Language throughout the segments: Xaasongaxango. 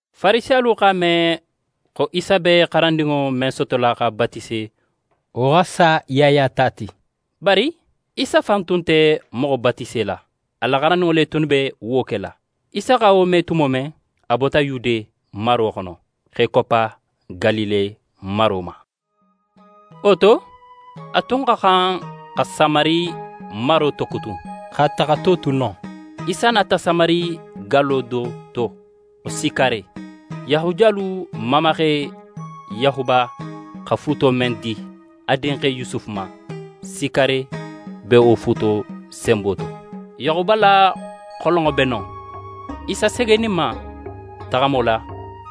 Farisiyalu x'a me xo Isa be xarandinŋo men sotola x'a batise, wo xa sa Yaya ta ti. Bari Isa fan tun nte moxo batisela. A la xarandinŋo le tunnu be wo kela. Isa xa wo me tumo men, a bota Yude maro xono, x'é koppa Galile maro ma. Wo to, a tun xa xan xa Samari maro tokutun. X'a taxato tu non, Isa nata Samari gallo do to xo Sikare. Yahudiyalu mamaxe Yaxuba xa fuuto men di a dinxe Yusufu ma, Sikare be wo fuuto senbo to. Yaxuba la xolonŋo be non. Isa segeninma taxamo la,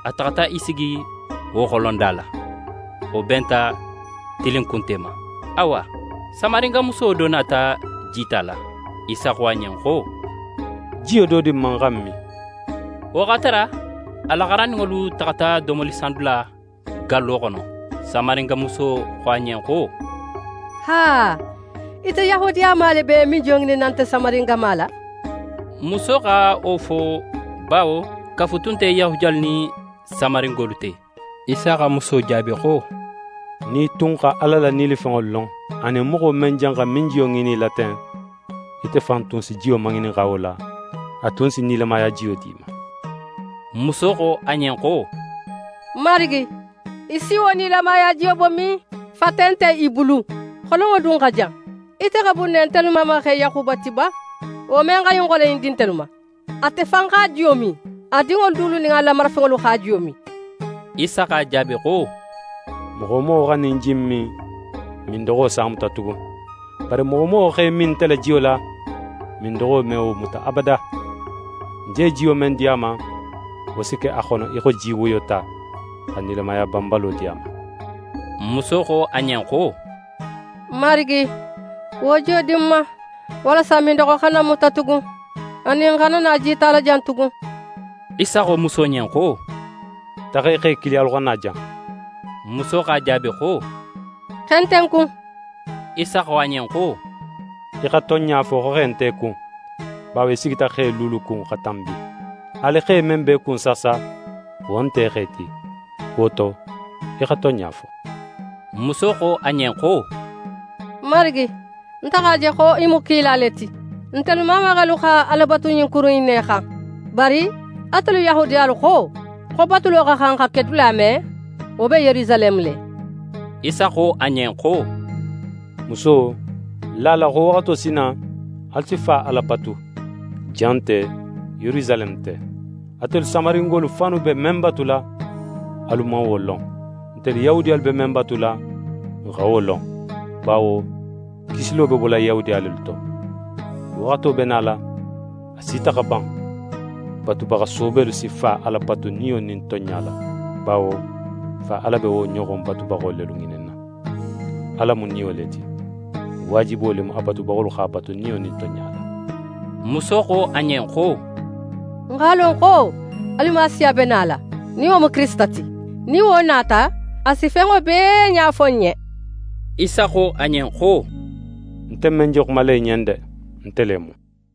a taxata í sigi wo xolonda la. Wo benta tilinkunte ma. Awa, Samaringamuso do nata jita la. Isa xo a ɲen xo: «Jiyo do di ń ma, ń xa ń min.» Wo x'a tara a la xarandinŋolu taxata domolisandula gallo xono. Samaringamuso xo a ɲen xo: «Aa, ite Yahudiyama le be minnijiyo ŋininna nte Samaringama la?» Muso xa wo fo, bawo kafu tun nte Yahudiyalu nin Samaringolu te. Isa xa muso jaabi xo: «Nin í tun xa Ala la nilifenŋo lon anin moxo men janxa minjiyo ŋinin í la ten, ite fan tun si jiyo maŋininxa wo la, a tun si nilamaya jiyo d'í ma.» Muso xo a ɲen xo: «Marigi, í si wo nilamaya jiyo bo min? Fate nte í bulu, xolonŋo dun xa jan. Ite xa bun ne ntelu mamaxe Yaxuba ti ba, wo men xa ɲin xolon in di ntelu ma? Ate fan x'a jiyo min, a dinŋolu dulu nin a la marafenŋolu x'a jiyo min.» Isa x'a jaabi xo: «Moxo wo moxo xa ɲin ji in min, mindoxo s'a muta tugun. Bari moxo wo moxo x'é min nte la jiyo la, mindoxo me wo muta abada. Ń je jiyo men di a ma, wo si ke a xono í xo ji woyota, xa nilamaya banbalo di a ma.» Muso xo a ɲen xo: «Marigi, wo jiyo di ń ma, walasa mindoxo xana ń muta tugun, anin ń xana na jita la jan tugun.» Isa xo muso ɲen xo: «Taxa í xe kili, alu xa na jan.» Muso x'a jaabi xo: «Xe nte ń kun.» Isa xo a ɲen xo: «Í xa tonɲa fo, xo xe nte í kun; bawo í sigita xe luulu kun xa tanbi. Haali xe men b'é kun saasa, wo nte í xe ti. Wo to, í xa tonɲa fo.» Muso xo a ɲen xo: «Marigi, nte x'a je xo í mu kila le ti. Ntelu mamaxelu xa Ala batu ɲin kuru in xan. Bari atelu Yahudiyalu xo, xo batulo xa xan xa ke dula men, wo be Yerusaleme le.» Isa xo a ɲen xo: «Muso, la a la, xo waxato si na, alu si Fa Ala batu, jan nte, Yerusaleme nte. Atelu Samaringolu fannu be men batula, alu man wo lon. Ntelu Yahudiyalu be men batula, n xa wo lon. Bawo kisilo be bola Yahudiya lelu to. Waxato be nala, a sita xa ban, batubaxa soobelu si Fa Ala batu niyo nin tonɲa la; bawo Fa Ala be wo ɲoxon batubaxo lelu ŋininna. Ala mu Niyo le ti. Waajibo le mu, a batubaxolu x'a batu niyo nin tonɲa la.» Muso xo a ɲen xo: «Ń x'a lon xo Alimasiya be nala, nin wo mu Kirisita ti. Nin wo nata, a si fenŋo bee ɲa fo n ɲen.» Isa xo a ɲen xo: «Nte men je xumala í ɲen de, nte le mu.»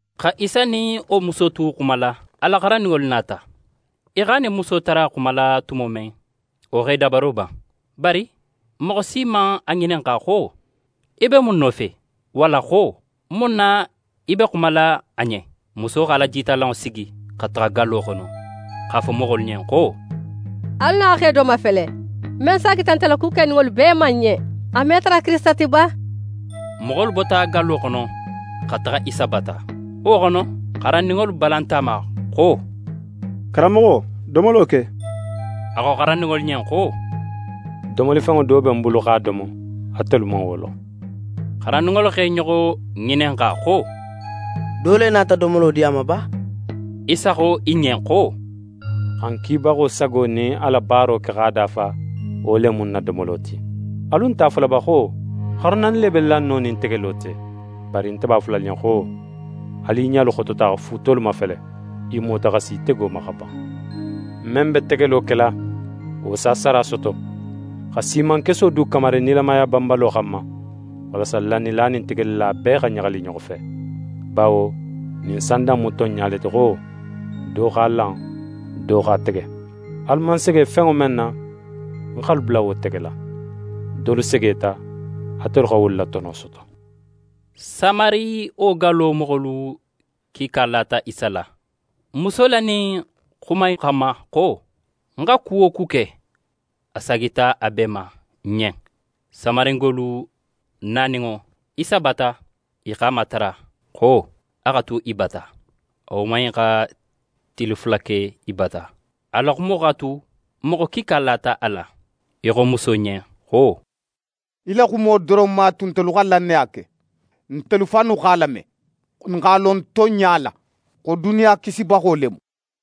Xa Isa nin wo muso tu xumala, a la xarandinŋolu nata. I x'a nin muso tara xumala tumo men, wo x'e dabaro ban. Bari moxo si man a ŋininxa xo «Í be mun nofe?» walla xo: «Mun na í be xumala a ɲen?» Muso x'a la jitalanŋo sigi, xa taxa gallo xono, x'a fo moxolu ɲen xo: «Alu na xe do mafele, men saagita nte la ku keninŋolu bee ma ń ɲen. A me tara Kirisita ti ba?» Moxolu bota gallo xono xa taxa Isa bata. Wo xono, xarandinŋolu balanta a ma xo: «Karanmoxo, domolo ke!» A xo xarandinŋolu ɲen xo: «Domolifenŋo do be ń bulu x'a domo, atelu man wo lon.» Xarandinŋolu x'e ɲoxo ŋininxa xo: «Do le nata domolo di a ma ba?» Isa xo i ɲen xo: «Xa ń kibaxo sago nin a la baaro ke x'a dafa, wo le mu ń na domolo ti. Alu nte a fola ba xo: “Xaru naani le be lanno nin tegelo te?” Bari nte b'a fola alu ɲen xo: Alu i ɲalu xotota xa fuutolu mafele, i mota xa si tego ma xa ban. Men be tegelo kela, wo s'a sara soto, xa siimankeso du kamari nilamaya banbalo xanma, walasa lannila nin tegelila bee xa ɲaxali i ɲoxo fe. Bawo ɲin sanda in mu tonɲa le ti xo: “Do x'a lan, do x'a tege.” Alu man sege fenŋo men na, ń x'alu bula wo tegela. Dolu segeta, atelu xa wolu la tono soto.» Samari wo gallo moxolu kiika lata Isa la, muso la ɲin xuma in xanma xo: «Ń xa ku wo ku ke, a saagita a bee ma ń ɲen.» Samaringolu naninŋo Isa bata, i x'a matara xo a xa tu i bata. A woman in xa tili fula ke i bata. A la xumo x'a tu moxo kiika lata a la. I xo muso ɲen xo: «Í la xumo doron man a tu ntelu xa lannaya ke. Ntelu fannu x'a lame, n x'a lon tonɲa la, xo duniya Kisibaxo le mu.»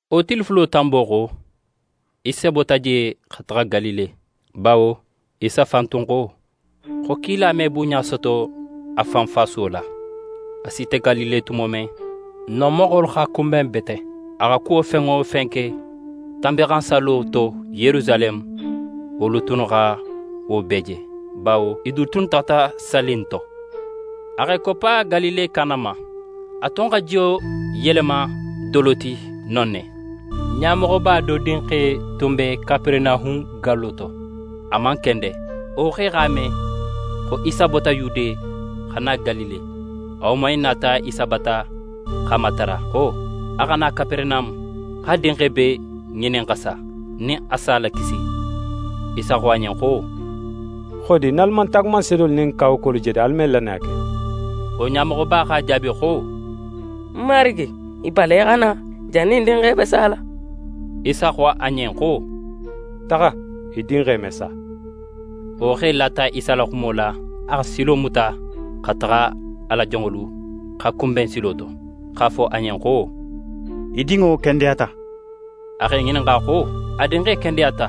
Wo tili fulo tanbo xo, Isa bota je xa taxa Galile, bawo Isa fan tun xo, xo kila me bunɲa soto a fan fasuwo la. A sita Galile tumo men, non moxolu x'a kunben bete. A xa kuwo fen wo fen ke Tanbinxansallo to Yerusaleme, wolu tunnu xa wo bee je, bawo i du tunnu taxata salli in to. A x'é koppa Galile Kana ma. A tun xa jiyo yelema dolo ti non ne. Ɲamoxoba do dinxe tun be Kaperenahun gallo to, a man kende. Wo xe x'a me, xo Isa bota Yude, xa na Galile. A woman in nata Isa bata x'a matara, xo a xa na Kaperenahun, a dinxe be ŋinin xa sa, nin a s'a lakisi. Isa xo a ɲen xo: «Xodi, nin alu man taagumanseedolu nin kawakuwolu je de, alu me lannaya ke?» Wo ɲamoxoba x'a jaabi xo: «Marigi, í balan í xa na jannin ń dinxe be sala.» Isa xo a ɲen xo: «Taxa! Í dinxe me sa.» Wo xe lata Isa la xumo la. A xa silo muta xa taxa. A la jonŋolu x'a kunben silo to, x'a fo a ɲen xo: «Í dinŋo kendeyata.» A x'e ŋininxa xo a dinxe kendeyata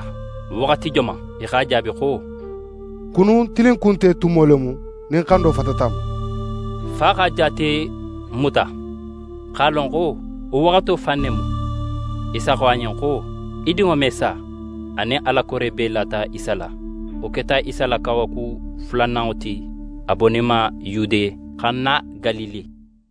waxati joman? I x'a jaabi xo: «Kunun tilinkunte tumo le mu, nin xando fatata a ma.» Fa xa jaate muta, x'a lon xo wo waxato fan ne mu, Isa xo a ɲen xo: «Í dinŋo me sa.» A nin a la kore bee lata Isa la. Wo keta Isa la kawaku fulananŋo ti, a boninma Yude, xa na Galile.